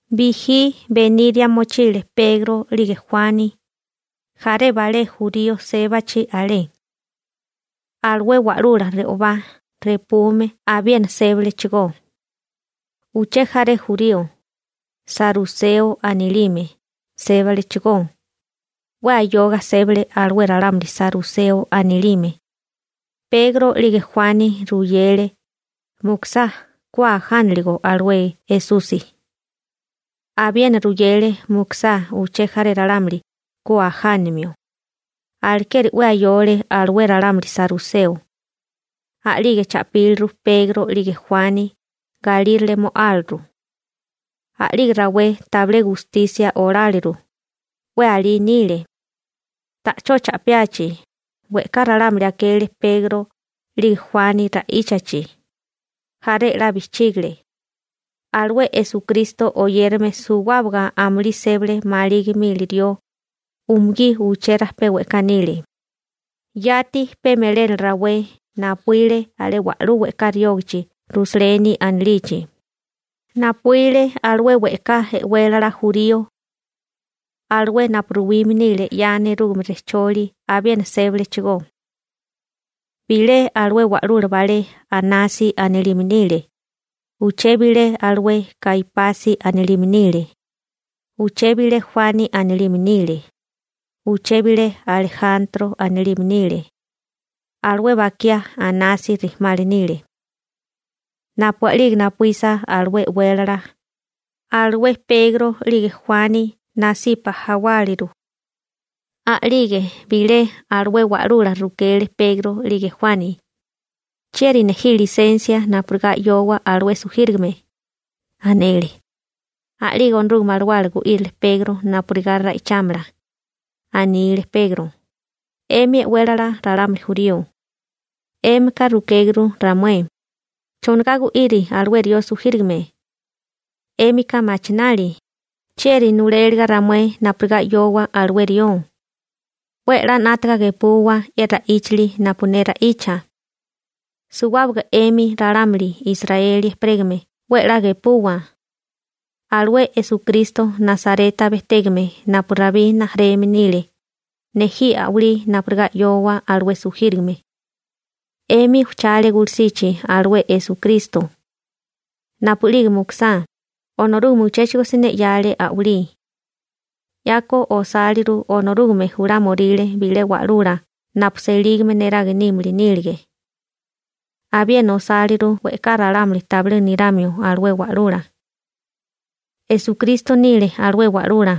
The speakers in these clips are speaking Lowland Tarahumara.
Bijí beníria mochile Pegro 'lige Juani, jaré balé jurío sébachi alé. Alué wa'lula re'obá repume abiena sébalechigó. Uché jaré jurío, saruseo anilime, sébalechigó. 'We ayoga sébale alué ralámuli saruseo anilime. Pegro 'lige Juani ruyele mukusá, ku ajánaligo alué Esusi. Abiena ruyele mukusá uché jaré ralámuli, ku ajánamio. Alekeri 'we ayole alué ralámuli saruseo. A'lige cha'píliru Pegro 'lige Juani, galírale mo'áliru. A'lige rawé tabilé gustisia oláleru, 'we alí nile. Ta'chó cha'piachi, we'ká ralámuli akele Pegro, 'lige Juani ra'íchachi. Jaré 'la bijchígile. Alué Esukristo oyérame suwábaga amulí sébale maligi mili rió, umugí uché rajpé we'ká nile. Yati pe melénala rawé napuíle alé wa'lú we'ká riógichi Rusaleni anilichi, napuíle alué we'ká e'wélala jurío. Alué napu ruwime nile 'ya nerúgame rejcholi abiena sébalechigó. Bilé alué wa'lula balé Anasi anilime nile. Uché bilé alué Kaipasi anilime nile. Uché bilé Juani anilime nile. Uché bilé Alejantro anilime nile. Alué bakiá Anasi rijimala nile. Napu a'lige napuísa alué e'wélala, alué Pegro 'lige Juani nasipa jawáliru. A'lige bilé alué wa'lula rukele Pegro 'lige Juani: ―¿Chieri nejí lisensia napurigá 'yowa alué sujírigame? ―anele. A'lige Onorúgame Alawala gu'írile Pegro napurigá ra'ichámala. Anile Pegro: ―'Emi e'wélala ralámuli jurío. 'Émika rukéguru ramué: «¿Chonigá gu'iri alué rió sujírigame?» 'Émika machinali: «¿Chieri nuléliga ramué napurigá 'yowa alué rió?» 'We 'la 'nátaga gepuwa ye ra'íchali napu ne ra'icha. Suwábaga 'emi ralámuli Israeli ejperégame 'we a'lá gepuwa. Alué Esukristo Nasareta bejtégame napu Rabí rijimala nile, nejí a'walí napurigá 'yowa alué sujírigame. 'Emi ujchale gulusichi alué Esukristo. Napu'lige mukusá, Onorúgame uchéchigo siné 'yale a'walí. 'Yako osáliru Onorúgame julámoríle bilé wa'lula napu selígame neraga nímili nílige. Abiena osáliru we'ká ralámuli tabilé niramio alué wa'lula. Esukristo nile alué wa'lula.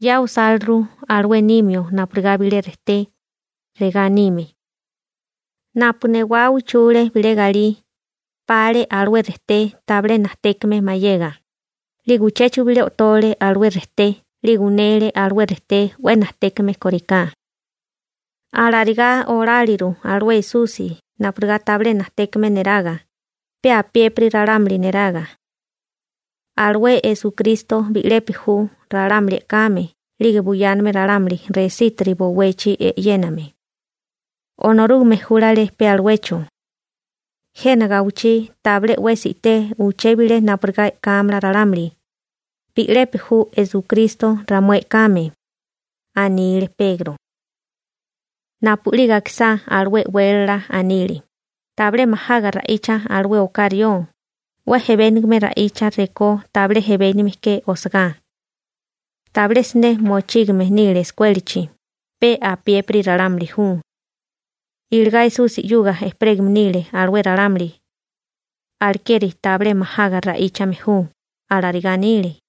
'Ya osáliru alué nimio napurigá bilé rejté. Regá anime: Napu newá uchule bilé galí, pale alué rejté tabilé najtékame mayega, 'lige uchéchigo bilé o'tole alué rejté 'lige unele alué rejté 'we najtékame kóriká. Alarigá oláliru alué Esusi napurigá tabilé najtékame neraga, pe apiépiri ralámuli neraga. Alué Esukristo bi'lepi ju ralámuli e'kame 'lige buyáname ralámuli resítiri bowechi e'yéname. Onorúgame júlale pe aluecho. Jena gawichí tabilé 'wesi i'té uché bilé napurigá e'kámala ralámuli. Bi'lepi ju Esukristo ramué e'kame ―anile Pegro. Napu'lige akisá alué e'wélala, anile: ―Tabilé majaga ra'icha alué oká rió, 'we ejebéniga ra'icha rekó tabilé ejebénigame ke osagá. Tabilé siné mochígame nile eskuélachi, pe apiépiri ralámuli ju. Iligá Esusi 'yuga ejperégame nile alué ralámuli. Alekeri tabilé majaga ra'íchame ju ―alarigá anile.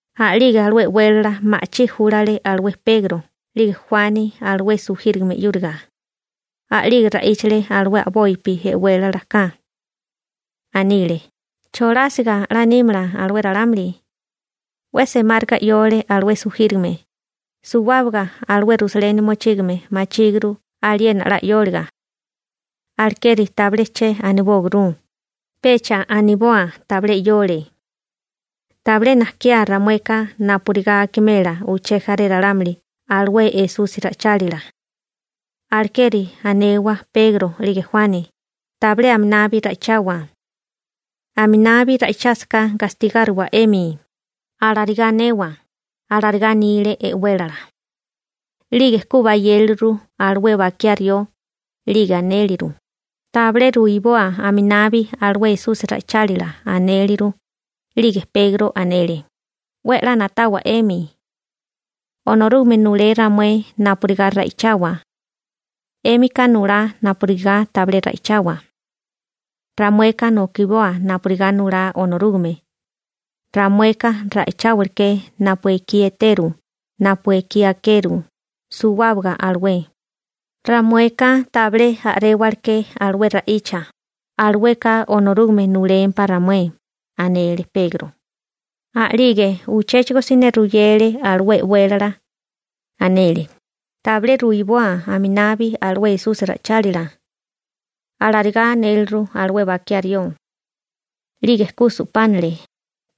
A'lige alué e'wélala ma'chí júlale alué Pegro 'lige Juani alué sujírigame 'yúriga. A'lige ra'íchale alué a'bopi e'wélala ka. Anile: ―¿Cholásiga 'la nímala alué oká rió? 'La sa'wale alué sujírigame. Suwábaga alué Rusaleni mochígame machíguru aliena 'la sa'wáliga. Alekeri tabilé chérigá anewa, pecha aniboa tabilé sa'wale. Tabilé najkiá ramueka napurigá akimela uché jaré ralámuli alué Esusi ra'ichálila. Alekeri anewa Pegro 'lige Juani: «Tabilé aminabi ra'ichawa. Aminabi ra'ichásaká gastigáriwa 'emi.» Alarigá anewa ―alarigá anile e'wélala. 'Lige ku bayéleru alué bakiá rió, 'lige anéleru: ―Tabilé ruiboa aminabi alué Esusi nila ra'íchali ―anéleru. 'Lige Pegro anele: ―'We 'la na'tawa 'emi. Onorúgame nulé ramué napurigá ra'ichawa. 'Émika nulá napurigá tabilé ra'ichawa. Ramueka nokiboa napurigá nulá Onorúgame. Ramueka ra'icháwaleké napu ekí eteru, napu ekí akerú, suwábaga alué. Ramueka tabilé a'réwaleké alué ra'icha, alueka Onorúgame nulémpá ramué ―anele Pegro. A'lige uchéchigo siné ruyele alué e'wélala. Anele: ―Tabilé ruiboa aminabi alué Esusi nila ra'íchali. ―Alarigá anéleru alué bakiá rió. 'Lige ku su'pánale,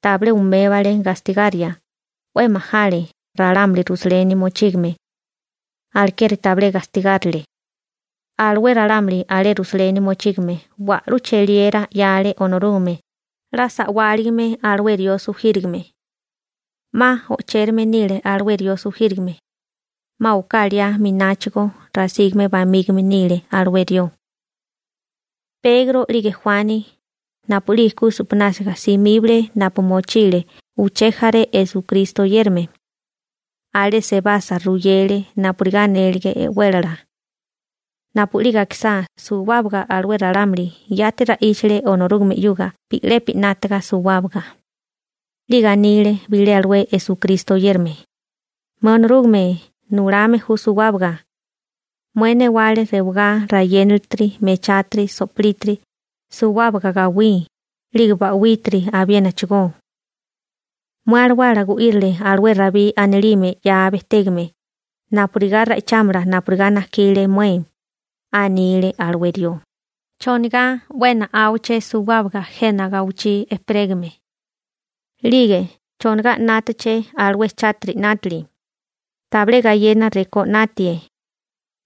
tabilé umébale gastigaria, 'we majale ralámuli Rusaleni mochígame. Alekeri tabilé gastigárile. Alué ralámuli alé Rusaleni mochígame wa'lú cheliera 'yale Onorúgame, 'la sa'wárigame alué rió sujírigame. 'Ma o'chérame nile alué rió sujírigame. 'Ma oká liá mináchigo rasígame bamígame nile alué rió. Pegro 'lige Juani, napu'lige ku su'pinásiga simíbale napu mochile uché jaré Esukristo oyérame. Alé sebasa ruyele napurigá anélige e'wélala. Napu'lige akisá, suwábaga alué ralámuli yati ra'íchale Onorúgame 'yuga bi'lepi 'nátaga suwábaga. 'Lige anile bilé alué Esukristo oyérame: ―Mué Onorúgame nulame ju suwábaga. Mué newale rewagá, rayénalitiri, mechátiri, so'polítiri, suwábaga gawí, 'lige ba'wítiri abiénachigó. Mué Alawala gu'írile alué Rabí anilime 'ya bejtégame napurigá ra'ichámala napurigá najkile mué. Anile alué rió: ¿Chonigá 'we na'áwaché suwábaga jena gawichí ejperégame? 'Lige ¿chonigá 'nátaché alué chátiri 'nátili? Tabilé gayena rekó 'natie.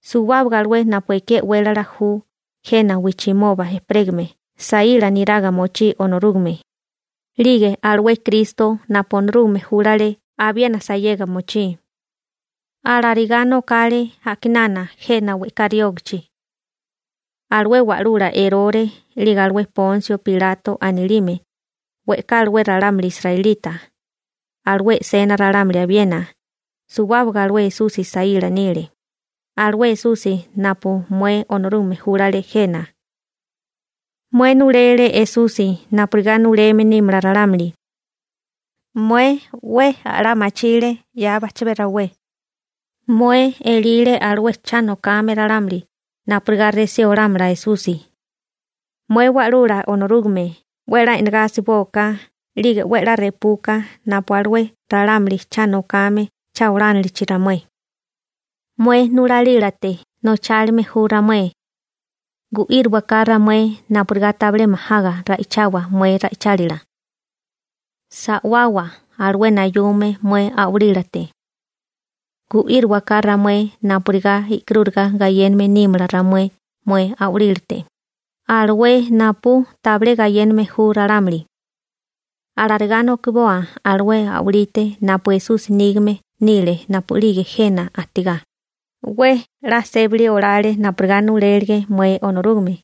Suwábaga alué napu ekí e'wélala ju jena wijchimoba ejperégame saíla niraga mochí Onorúgame, 'lige alué Kristo napu Onorúgame júlale abiena sayega mochí. › Alarigá nokale a'kinana jena we'ká riógachi. Alué wa'lula Erore, 'lige alué Ponsio Pilato anilime, we'ká alué ralámuli israelita, alué e'sena ralámuli abiena, suwábaga alué Esusi saíla nile, alué Esusi napu mué Onorúgame júlale jena. Mué nulele Esusi napurigá nuleme nímala ralámuli. Mué 'we a'lá machile 'ya bajchabé rawé. Mué elile alué cha nokame ralámuli napurigá resí olámala Esusi. Mué Wa'lula Onorúgame, 'we a'lá e'nagá asiboka 'lige 'we 'la repuka napu alué ralámuli cha nokame cha olánilichi ramué. Mué nulalílate nochálime ju ramué. Gu'írowaká ramué napurigá tabilé majaga ra'ichawa mué ra'ichálila. Sa'wawa alué nayume mué a'walílate. Gu'írowaká ramué napurigá e'karúriga gayéname nímala ramué mué a'walílate, alué napu tabilé gayéname ju ralámuli. Alarigá nokiboa alué a'walite napu Esusi nígame nile napu'lige jena ajtigá, 'we 'la sébali olale napurigá nulélige mué Onorúgame.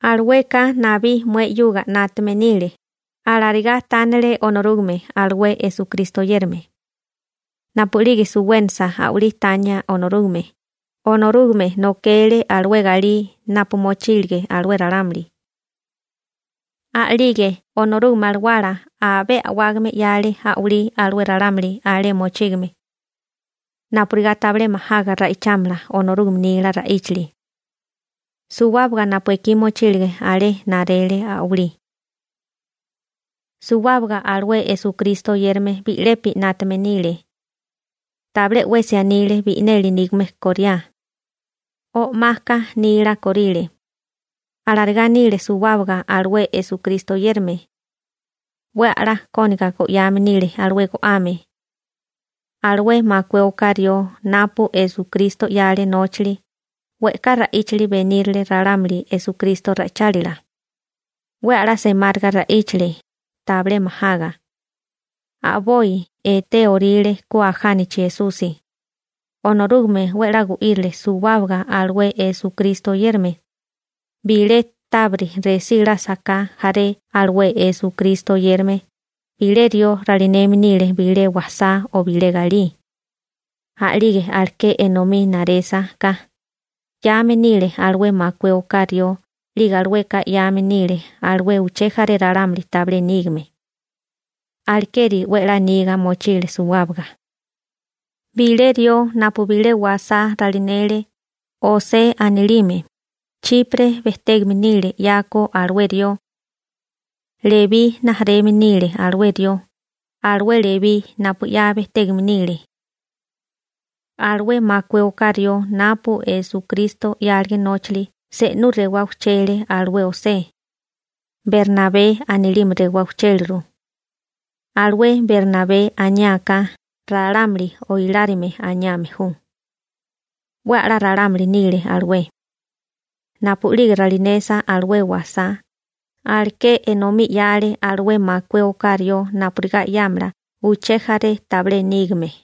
Alueka nabí mué 'yuga 'nátame nile ―alarigá tánale Onorúgame alué Esukristo oyérame. Napu'lige suwénasa a'walí tania Onorúgame, Onorúgame nokele alué galí napu mochílige alué ralámuli. A'lige Onorúgame Alawala abé a'wágame 'yale a'walí alué ralámuli alé mochígame napurigá tabilé majaga ra'ichámala Onorúgame nila ra'íchali. Suwábaga napu ekí mochílige alé narele a'walí. Suwábaga alué Esukristo oyérame bi'lepi 'nátame nile. Tabilé 'wesi anile bi'neli nígame koriá. O'maka nila korile. Alarigá nile suwábaga alué Esukristo oyérame. 'We a'lá kóniga go'yame nile alué go'ame. Alué makué oká rió napu Esukristo 'yale nóchali, we'ká ra'íchili benírile ralámuli Esukristo ra'ichálila. 'We a'lá semáriga ra'íchale, tabilé majaga. A'boi etéoríle ku ajánachi Esusi. Onorúgame 'we 'la gu'írile suwábaga alué Esukristo oyérame. Bilé tábiriti resílásaká jaré alué Esukristo oyérame, bilé rió ralineme nile bilé wasá o bilé galí. A'lige aleké enomí narésaká, 'yame nile alué makué oká rió 'lige alueka 'yame nile alué uché jaré ralámuli tabilé nígame. Alekeri 'we a'lá niga mochile suwábaga. Bilé rió napu bilé wasá ralinele, José anilime, Chipre bejtégame nile 'yako alué rió. Lebí rijimala nile alué rió, alué Lebí napu 'ya bejtégame nile. Alué makué oká rió napu Esukristo 'yálige nóchali se'nú rewá ujchele alué José. Bernabé anilime rewá ujchéliru. Alué Bernabé aniá ka ‹‹ralámuli oilárime» aniame ju. 'We a'lá ralámuli nile alué. Napu'lige ralinesa alué wasá, aleké enomí 'yale alué makué oká rió napurigá 'yámala uché jaré tabilé nígame.